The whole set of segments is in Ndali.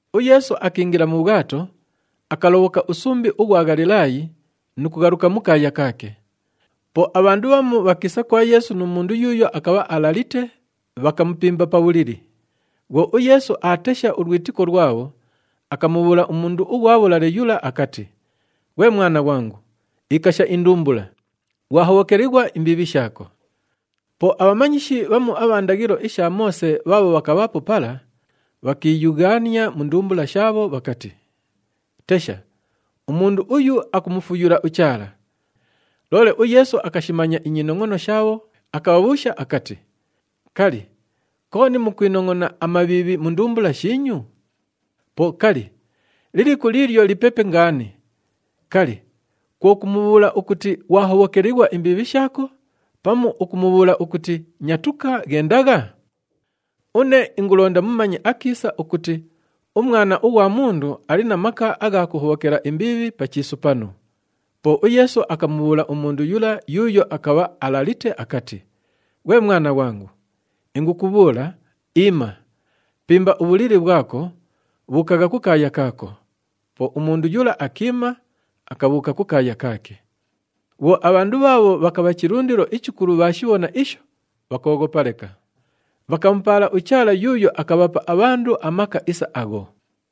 UYeesu akiingila mu bhwato, akalobhoka usumbi ughwa Ghalilaayi nu kughaluka mu kaaya kaake. Po abhandu bhamu bhakiisa kwa Yeesu nu mundu yuuyo akabha alalite, bhakamupimba pa bhulili. Bhwo uYeesu aatesha ulwitiko lwabho, akamubhuula umundu ughwa bhulale yula akati, “Ghwe mwana ghwangu, ikasha indumbula! Ghwahobhokelighwa imbiibhi shaako.” Po abhamanyishi bhamu abha ndaghilo isha Moose bhaabho bhakabhaapo pala, bhakiiyughaania mu ndumbula shaabho bhakati, “Tesha, umundu uyu akumufuyula uChaala!” Loole uYeesu akashimanya inyinongʼono shaabho, akabhabhuusha akati, “Kali, kooni mukwinongʼona amabhiibhi mu ndumbula shiinyu? Po kali, liliku liilyo lipepe ngaani? Kali, kwo kumubhuula ukuti, ‘Ghwahobhokelighwa imbiibhi shaako,’ pamu ukumubhuula ukuti, ‘Nyatuka, ghendagha’? Une ingulonda mumanye akiisa ukuti uMwana ughwa Mundu ali na maka agha kuhobhokela imbiibhi pa chiisu panu.” Po uYeesu akamubhuula umundu yula yuuyo akabha alalite akati, “Ghwe mwana ghwangu, ingukubhuula, iima! Pimba ubhulili bhwako, bhuukagha kukaaya kaako.” Po umundu yula akiima, akabhuuka kukaaya kaake. Bhwo abhandu bhaabho bhakabha chilundilo ichikulu bhaashibhona isho, bhakooghopa leka. Bhakamupaala uChaala yuuyo akabhapa abhandu amaka isa agho.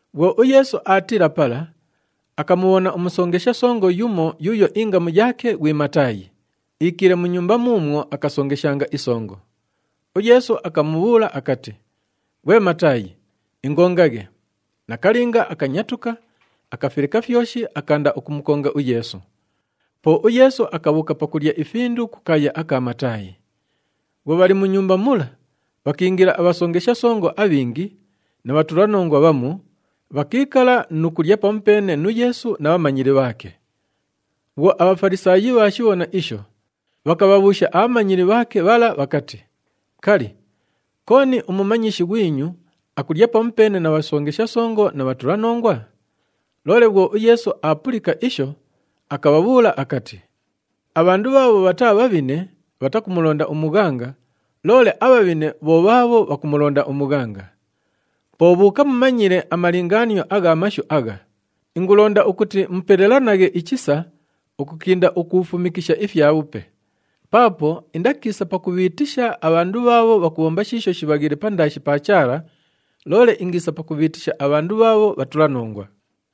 Bhwo uYeesu aatiila pala, akamubhona umusongesha songo yumo yuuyo ingamu yaake ghwi Mataayi, iikiile mu nyumba muumwo akasongeshanga isongo. UYeesu akamubhuula akati, “Ghwe Mataayi, ingongaghe.” Nakalinga akanyatuka, akafileka fyoshi, akaanda ukumukonga uYeesu. Po uYeesu akabhuuka pakulya ifindu kukaaya aka Mataayi. Bhwo bhali mu nyumba mula, bhakiingila abhasongesha songo abhingi na bhatulanongwa bhamu, bhakiikala nu kulya pamupeene nu Yeesu na bhamanyili bhaake. Bhwo aBhafalisaayi bhaashibhona isho, bhakabhabhuusha abhamanyili bhaake bhala bhakati, “Kali, kooni umumanyishi ghwinyu akulya pamupeene na bhasongesha songo na bhatulanongwa?” Loole bhwo uYeesu aapulika isho, akabhabhuula akati, “Abhandu bhaabho bhataa bhabhine bhatakumulonda umughanga, loole abhabhine bho bhaabho bhakumulonda umughanga! Po bhuuka mumanyile amalingaanio agha mashu agha, ‘Ingulonda ukuti mupelelanaghe ichisa ukukinda ukuufumikisha ifyabhupe.’ Paapo indakiisa pakubhiitisha abhandu bhaabho bhakubhomba shiisho shibhaghiile pandaashi pa Chaala, loole ingiisa pakubhiitisha abhandu bhaabho bhatulanongwa.”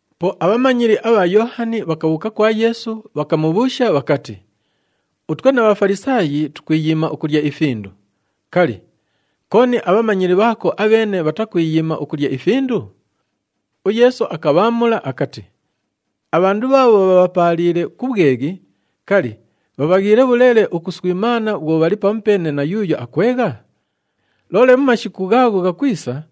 Po abhamanyili abha Yoohani bhakabhuuka kwa Yeesu, bhakamubhuusha bhakati, “Utwe na Bhafalisaayi tukwiyiima ukulya ifindu. Kali, kooni abhamanyili bhaako abheene bhatakwiyiima ukulya ifindu?” UYeesu akabhaamula akati, “Abhandu bhaabho bhabhapaaliile ku bhweghi, kali, bhabhaghiile bhuleele ukuswimaana bhwo bhali pamupeene na yuuyo akwegha? Loole mu mashiku ghaagho ghakwisa,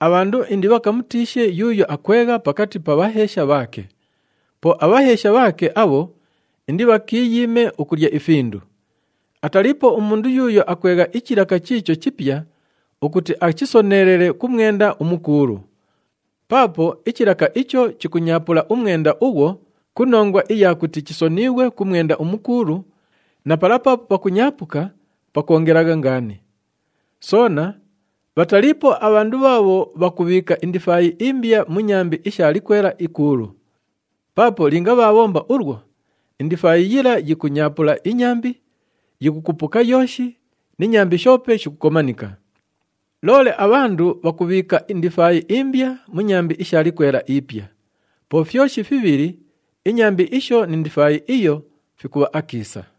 abhandu indibhakamutiishe yuuyo akwegha pakati pa bhaheesha bhaake. Po abhaheesha bhaake abho indibhakiiyiime ukulya ifindu. Ataliipo umundu yuuyo akwegha ichilaka chiicho chipya ukuti achisoneelele ku mwenda umukuulu. Paapo ichilaka icho chikunyaapula umwenda ughwo ku nongwa iya kuti chisoniighwe ku mwenda umukuulu, na pala paapo pakunyaapuka pakwongelagha ngaani. Soona bhataliipo abhandu bhaabho bhakubhiika indifaayi imbya mu nyambi isha likwela ikuulu. Paapo linga bhaabhomba ulwo, indifaayi yila yikunyaapula inyambi, yikukupuka yooshi ni nyambi shoope shikukomanika. Loole abhandu bhakubhiika indifaayi imbya mu nyambi isha likwela ipya. Po fyoshi fibhili, inyambi isho ni ndifaayi iyo fikubha akiisa!”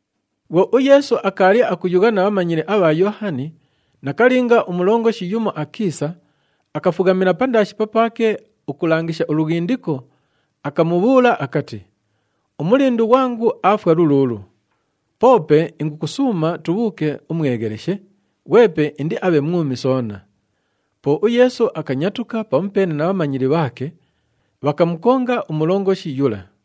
Bhwo uYeesu akaali akuyugha na bhamanyili abha Yoohani, nakalinga, umulongoshi yumo akiisa, akafughamila pandaashi papaake ukulangisha ulughindiko, akamubhuula akati, “Umulindu ghwangu aafwa luluulu. Poope ingukusuuma tubhuuke umwegheleshe, ghwepe indiabhe mwumi soona.” Po uYeesu akanyatuka pamupeene na bhamanyili bhaake, bhakamukonga umulongoshi yula.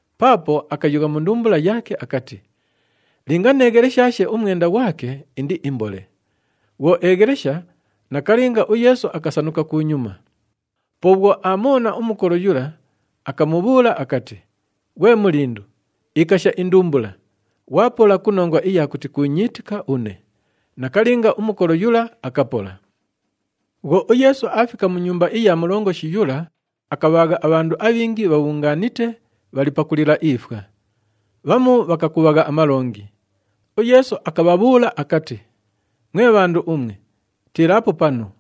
Paapo akayugha mu ndumbula yaake akati, “Linga neegheleshaashe umwenda ghwake, indiimbole.” Bhwo eeghelesha, nakalinga, uYeesu akasanuka kunyuma. Po bhwo aamubhona umukolo yula, akamubhuula akati, “Ghwe mulindu, ikasha indumbula, ghwapola ku nongwa iya kuti kuunyiitika une.” Nakalinga, umukolo yula akapola. Bhwo uYeesu aafika mu nyumba iya mulongoshi yula, akabhaagha abhandu abhingi bhabhungaanite, bhali pakulila ifwa. Bhamu bhakakubhagha amalongi. UYeesu akabhabhuula akati, “Mwe bhandu umwe, tiilaapo panu!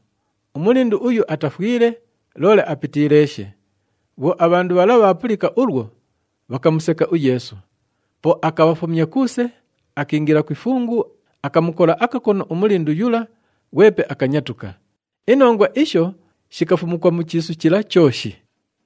Umulindu uyu atafwile, loole apitiileeshe!” Bhwo abhandu bhala bhaapulika ulwo, bhakamuseka uYeesu. Po akabhafumya kuuse, akiingila ku ifungu, akamukola akakono umulindu yula, ghwepe akanyatuka. Inongwa isho shikafumukwa mu chiisu chila chooshi.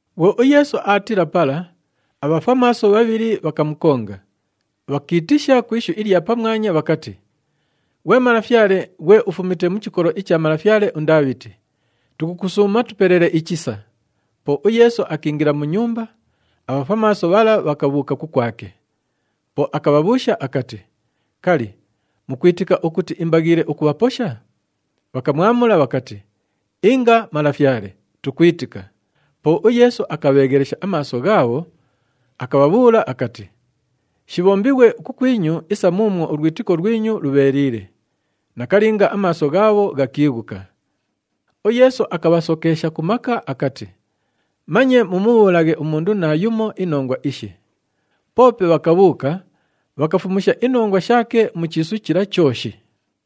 Bhwo uYeesu aatiila pala, abhafwamaaso bhabhili bhakamukonga, bhakiitisha ku ishu ilya pamwanya bhakati, “Ghwe Malafyale, ghwe ufumite mu chikolo icha malafyale uNdaabhiti, tukusuuma tupelele ichisa!” Po uYeesu akiingila mu nyumba, abhafwamaaso bhala bhakabhuuka kukwake. Po akabhabhuusha akati, “Kali, mukwitika ukuti imbaghiile ukubhaposha?” Bhakamwamula bhakati, “Inga, Malafyale! Tukwitika.” Po uYeesu akabheeghelesha amaaso ghaabho, akabhabhuula akati, “Shibhombighwe kukwinyu isa muumwo ulwitiko lwinyu lubheeliile.” Nakalinga, amaaso ghaabho ghakiighuka. UYeesu akabhasokeesha ku maka akati, “Manye mumubhuulaghe umundu naayumo inongwa ishi!” Poope bhakabhuuka, bhakafumusha inongwa shaake mu chiisu chila chooshi.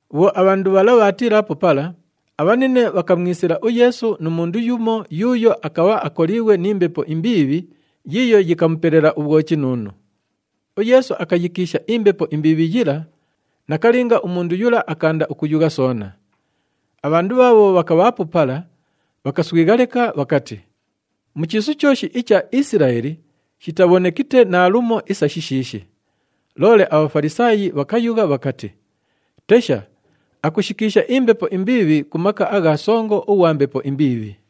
Bhwo abhandu bhala bhaatiilaapo pala, abhanine bhakamwisila uYeesu nu mundu yumo yuuyo akabha akoliighwe ni mbepo imbiibhi yiiyo yikamupelela ubhwochinuunu. UYeesu akayikiisha imbepo imbiibhi yila, nakalinga, umundu yula akaanda ukuyugha soona. Abhandu bhaabho bhakabhaapo pala bhakaswigha leka, bhakati, “Mu chiisu chooshi icha Isilaeli shitabhonekite naalumo isa shishiishi!” Loole aBhafalisaayi bhakayugha bhakati, “Tesha, akushikiisha imbepo imbiibhi ku maka agha songo ughwa mbepo imbiibhi!”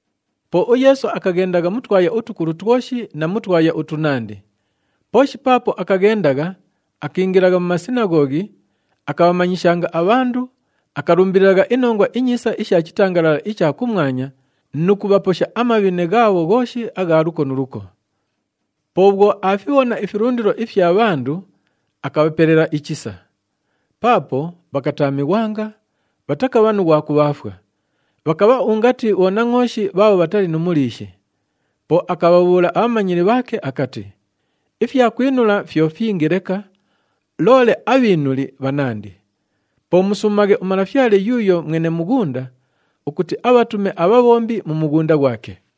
Po uYeesu akaghendagha mu twaya utukulu twoshi na mu twaya utunandi. Pooshi paapo akaghendagha, akiingilagha mu masinaghoghi, akabhamanyishanga abhandu, akalumbililagha iNongwa iNyiisa isha chitangalala icha kumwanya nu kubhaposha amabhine ghaabho ghooshi agha luko nu luko. Po bhwo aafibhona ifilundilo ifya bhandu, akabhapelela ichisa. Paapo bhakataamighwanga, bhatakabha nu ghwa kubhaafwa, bhakabha ungati bhonangʼooshi bhaabho bhatali nu muliishi. Po akabhabhuula abhamanyili bhaake akati, “Ifyakwinula fyo fyingi leka, loole abhiinuli bhanandi. Po musuumaghe uMalafyale yuuyo mwene mughunda ukuti abhatume abhabhombi mu mughunda ghwake.”